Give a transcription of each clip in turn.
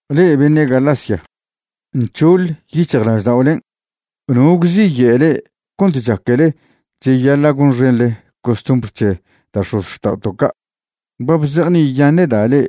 Le'e beṉe' Galacia, nc̱hoḻ yic̱hjlažda'olen'. ¿No gwziye' le'e cont chaquele cheyaḻa' gonxenḻe costumbr c̱he da' x̱ozxta'oto' ca'? Ba bzejni'iyaṉe'da' le'e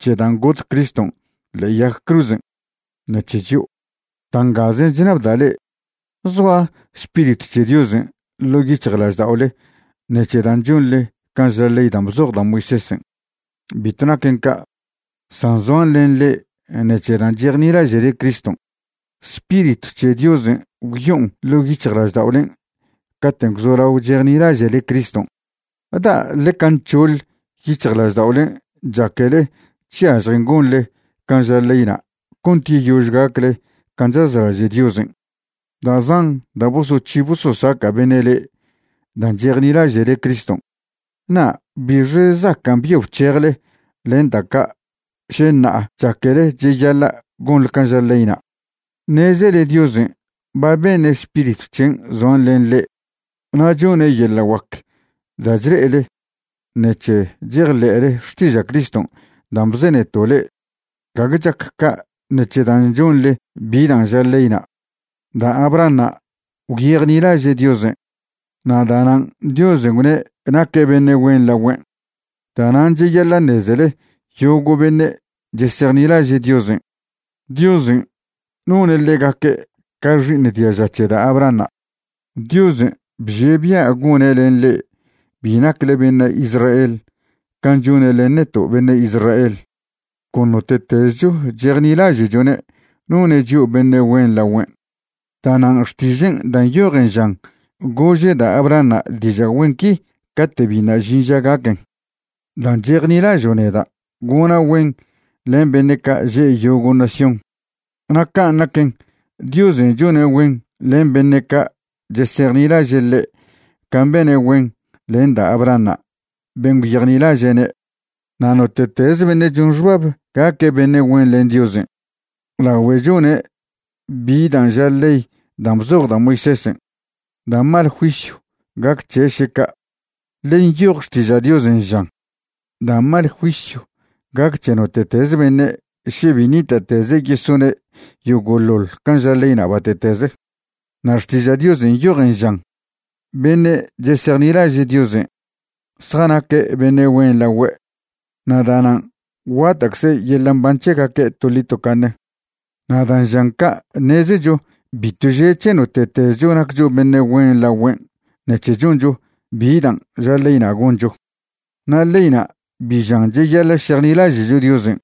c̱he dan' got Criston' ḻe'e yag cruzen' ṉec̱he chio'. Da' ngazen' chṉabda' le'e: ¿Zoa Spiritw c̱he Diosen' ḻo' yic̱hjlažda'ole ṉec̱he dan' chonḻe can' ža ley dan' bzoj da' Moisésen'? Bitw naquen ca', san zoan len le'e ṉec̱he dan' chejnilaže'le Criston'. Spiritw c̱he Diosen' gwyo'on ḻo' yic̱hjlažda'olen' caten' gwzolao chejnilaže'le Criston'. ¿Da' ḻeca nc̱hoḻ yic̱hjlažda'olen' chaquele chyažjen gonle can' ža leyna' cont yeyož gacle can' chazlaže' Diosen'? Da' zan da' bosoc̱hi bososaca' beṉe' le'e dan' chejnilaže'le Criston'. ¿Na' bixe zacan' byo bchejele len da' ca' še ṉa'a chaquele cheyaḻa' gonḻe can' ža leyna'? Ṉezele Diosen' ba beṉe' Spiritw c̱hen' zoan len le'e na' chone' yeḻa' guac da' chle'ele ṉec̱he chejḻe'le xtiža' Criston' dan' bzeneto' le'e, gague chac ca' ṉec̱he dan' chonḻe bi dan' ža leyna'. Da' Abrahanṉa' gwyejnilaže' Diosen', na' da'nan' Diosen' gwne' naque' beṉe' güen lagüen'. Da'nan' cheyaḻa' ṉezele yogo' beṉe' chesejnilaže' Diosen', Diosen' none' ḻegaque' ca xi'iṉ diaža c̱he da' Abrahanṉa'. Diosen' bžie' bia' gone' len le'e bi nacle beṉe' Israel can' chone' len neto' beṉe' Israel, con note'tezcho chejnilaže'chone' none' chio' beṉe' güen lagüen'. Da'nan' Xtižen' dan' nyojen žan gože' da' Abrahanṉa' diža' güen qui cate' biṉa' žin ža gaquen': “Dan' chejnilažo' neda' gona' güen len beṉe' ca' že' yogo' nación.” Na' can' naquen, Diosen' chone' güen len beṉe' ca' chesejnilaže' ḻe' can' bene' güen len da' Abrahanṉa' ben' gwyejnilaže'ne'. Na' note'tez beṉe' chon xbab gaque' beṉe' güen len Diosen' lagüe' chone' bi dan' ža ley dan' bzoj da' Moisésen', da' mal juisyw gac c̱he' še ca', ḻe nyoj Xtiža' Diosen', žan': “Da' mal juisyw gac c̱he note'tez beṉe' še bi ṉita'teze' yesone' yogoḻoḻ can' ža leyna' bate'teze.” Na' Xtiža' Diosen' nyojen, žan: “Beṉe' chesejnilaže' Diosen' zjanaque' beṉe' güen lagüe', na' da'nan' guata'cze yeḻa' mban c̱hegaque' toḻi tocaṉe.” Na' da' žan ca' ṉezecho bitw že' c̱he note'tezcho naccho beṉe' güen lagüen' ṉec̱he choncho bi dan' ža leyna' goncho. Na' leyna' bi žan cheyaḻa' šejnilaže'cho Diosen',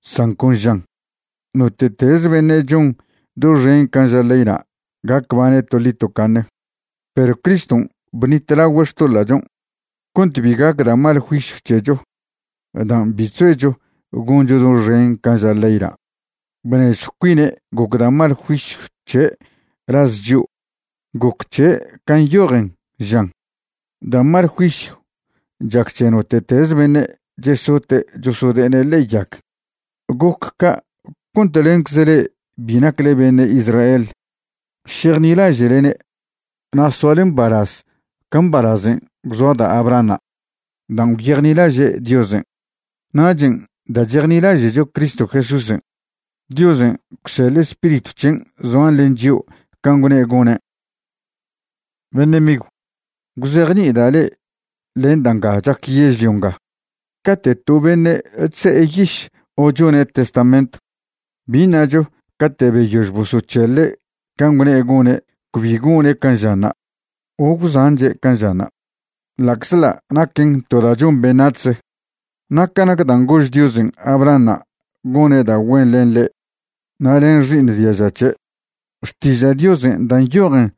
san con žan: “Note'teze beṉe' chon doxen can' ža leyna' gac bane' toḻi tocaṉe.” Perw Criston' bṉitlagüe' xtoḻa'chon' cont bi gac da' mal juisyw c̱hecho dan' bi chzoecho goncho doxen can' ža leyna'. Bnežjw cuine' goc da' mal juisyw c̱he' laz chio'. Goc c̱he' can' nyojen, žan: “Da' mal juisyw chac c̱he note'tez beṉe' chesote' chosode'ene' ḻe'e yag.” Goc ca' cont lencze le'e bi nacle beṉe' Israel šejnilaže'lene' na' soale mbalaz ca mbalazen' gwzoa da' Abrahanṉa' dan' gwyejnilaže' Diosen'. Nachen' da' chejnilaže'cho Cristo Jesúsen', Diosen' gwseḻe' Spiritw c̱hen' zoan len chio' can' gwne' gone'. Beṉe' migw, gwzejni'ida' le'e len da' nga chac yežlio nga: Cate' to beṉe' chze'e yiš o chone' testament, bi ṉacho cate' beyož bosoc̱heḻe' can' gwne' gone' cbi gone' can' žanṉa' o gwzanche' can' žanṉa', ḻa'czḻa' naquen to da' chon beṉac̱hze. Na' ca nac dan' gož Diosen' Abrahanṉa' gone' da' güen len ḻe' na' len xi'iṉ diaža c̱he', Xtiža' Diosen' dan' nyojen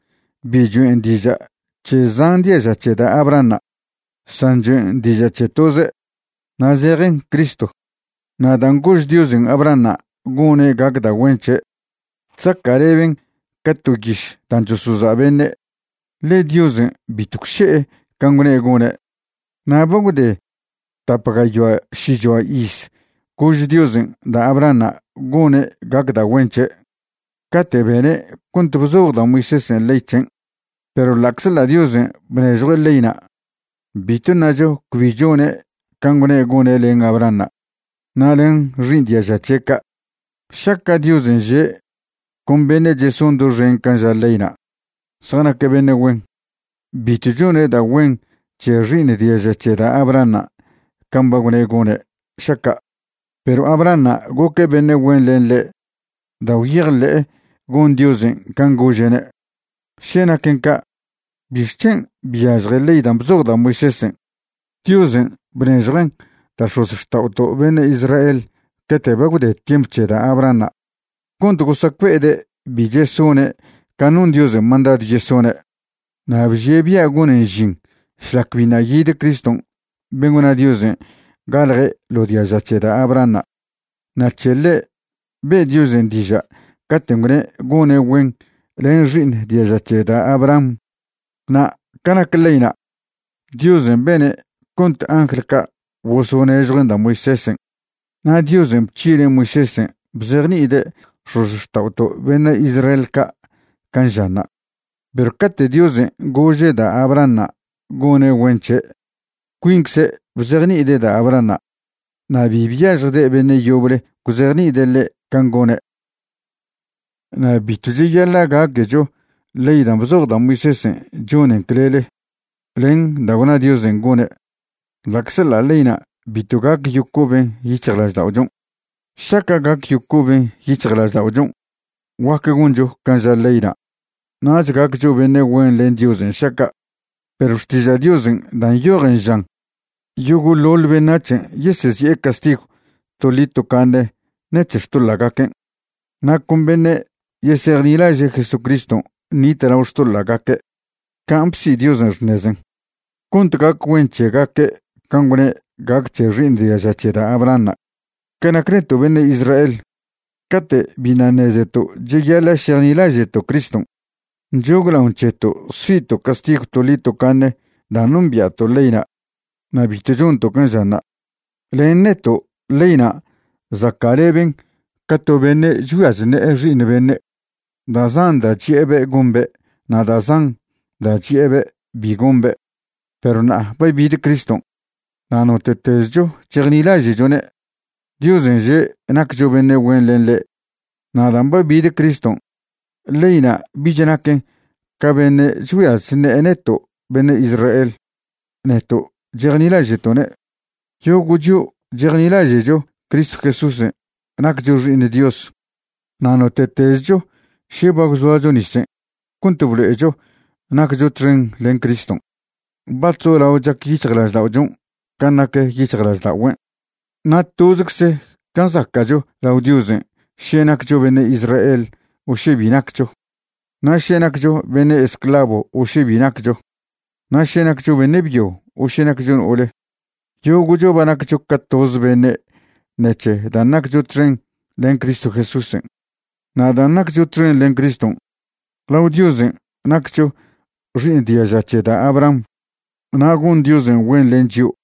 bi choen' diža' c̱he zan diaža c̱he da' Abrahanṉa', san choen' diža' c̱he toze', na' zejen Cristo. Na' dan' gož Diosen' Abrahanṉa' gone' gac da' güen c̱he', chzaca'leben ca to yiš dan' chosoza' beṉe', ḻe Diosen' bitw gwše'e can' gwne' gone'. Na' ba gwde tap gayoa šichoa iz gož Diosen' da' Abrahanṉa' gone' gac da' güen c̱he' cate' bene' cont bzoj da' Moisésen' ley c̱hen'. Perw ḻa'czḻa' Diosen' bnežjue' leyna', bitw ṉacho cbi chone' can' gwne' gone' len Abrahanṉa' na' len xi'iṉ diaža c̱he' ca'. Šaca' Diosen' že' con beṉe' cheson doxen can' ža leyna' zjanaque' beṉe' güen, bitw chone' da' güen c̱he xi'iṉ diaža c̱he da' Abrahanṉa' can' ba gwne' gone' šaca'. Perw Abrahanṉa' goque' beṉe' güen len ḻe' da' gwyejḻe'e gon Diosen' can' gože'ne'. Še naquen ca' ¿bixc̱hen byažje ley dan' bzoj da' Moisésen'? Diosen' bnežjuen' da' x̱ozxta'oto' beṉe' Israel cate' ba gwde tiemp c̱he da' Abrahanṉa' cont gosacbe'ede' bi chesone' can' non Diosen' mandadw yesone'. Na' bžie' bia' gonen žin šlac biṉa' yid Criston' ben' gwna Diosen' galje' ḻo diaža c̱he da' Abrahanṉa', na' c̱he ḻe' be' Diosen' diža' caten' gwne' gone' güen len xi'iṉ diaža c̱he da' Abraham. Na' ca nac leyna', Diosen' bene' cont angl ca' bosonežjuen' da' Moisésen'. Na' Diosen' bc̱hine' Moisésen' bzejni'ide' x̱ozxta'oto' beṉe' Israel ca' can' žanṉa'. Perw cate' Diosen' gože' da' Abrahanṉa' gone' güen c̱he', cuincze' bzejni'ide' da' Abrahanṉa', na' bi byažjde' beṉe' yoble gwzejni'ide' ḻe' can' gone'. Na' bitw cheyaḻa' gaquecho ley dan' bzoj da' Moisésen' chonen clele len da' gwna Diosen' gone' ḻa'czḻa' leyna' bitw gac yocoben yic̱hjlažda'ochon'. Šaca' gac yocoben yic̱hjlažda'ochon' guac goncho can' ža leyna' nach gaccho beṉe' güen len Diosen' šaca'. Perw Xtiža' Diosen' dan' nyojen žan yogo'ḻoḻ beṉac̱hen' yesezi'e castigw toḻi tocaṉe ṉec̱he xtoḻa'gaquen', na' con beṉe' yesejnilaže' Jesucriston' ṉitlao xtoḻa'gaque' can' bsi Diosen' xṉezen', cont gac güen c̱hegaque' can' gwne' gac c̱he xi'iṉ diaža c̱he da' Abrahanṉa'. Ca nac neto' beṉe' Israel, cate' biṉa' ṉezeto' cheyaḻa' šejnilaže'to' Criston', nchoglaon c̱heto' si'to' castigw toḻi tocaṉe dan' nombia'to' leyna' na' bitw chonto' can' žanṉa'. Len neto' leyna' zaca'leben ca to beṉe' chgüia chṉe'e xi'iṉ beṉe', da' zan da' chi'ebe' gombe' na' da' zan da' chi'ebe' bi gombe'. Perw ṉa'a ba bid Criston', na' note'tezcho chejnilaže'chone', Diosen' že' naccho beṉe' güen len ḻe'. Na' dan' ba bid Criston' leyna' bich naquen ca beṉe' chgüia chṉe'e neto' beṉe' Israel, neto' chejnilaže'to'ne'. Yogo' chio' chejnilaže'cho Cristo Jesúsen' naccho xi'iṉ Dios. Na' note'tezcho še ba gwzoacho nisen' cont blo'echo naccho txen len Criston', ba chzolao chac yic̱hjlažda'ochon' can' nac yic̱hjlažda'ogüen'. Na' tozecze can' zaca'cho lao Diosen' še naccho beṉe' Israel o še bi naccho, na' še naccho beṉe' esclavo o še bi naccho, na' še naccho beṉe' byo o še naccho no'ole. Yogo'cho ba naccho ca toze beṉe' ṉec̱he dan' naccho txen len Cristo Jesúsen'. Na' dan' naccho txen len Criston', lao Diosen' naccho xi'iṉ diaža c̱he da' Abraham, na' gon Diosen' güen len chio'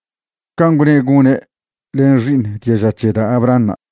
can' gwne' gone' len xi'iṉ diaža c̱he da' Abrahanṉa'.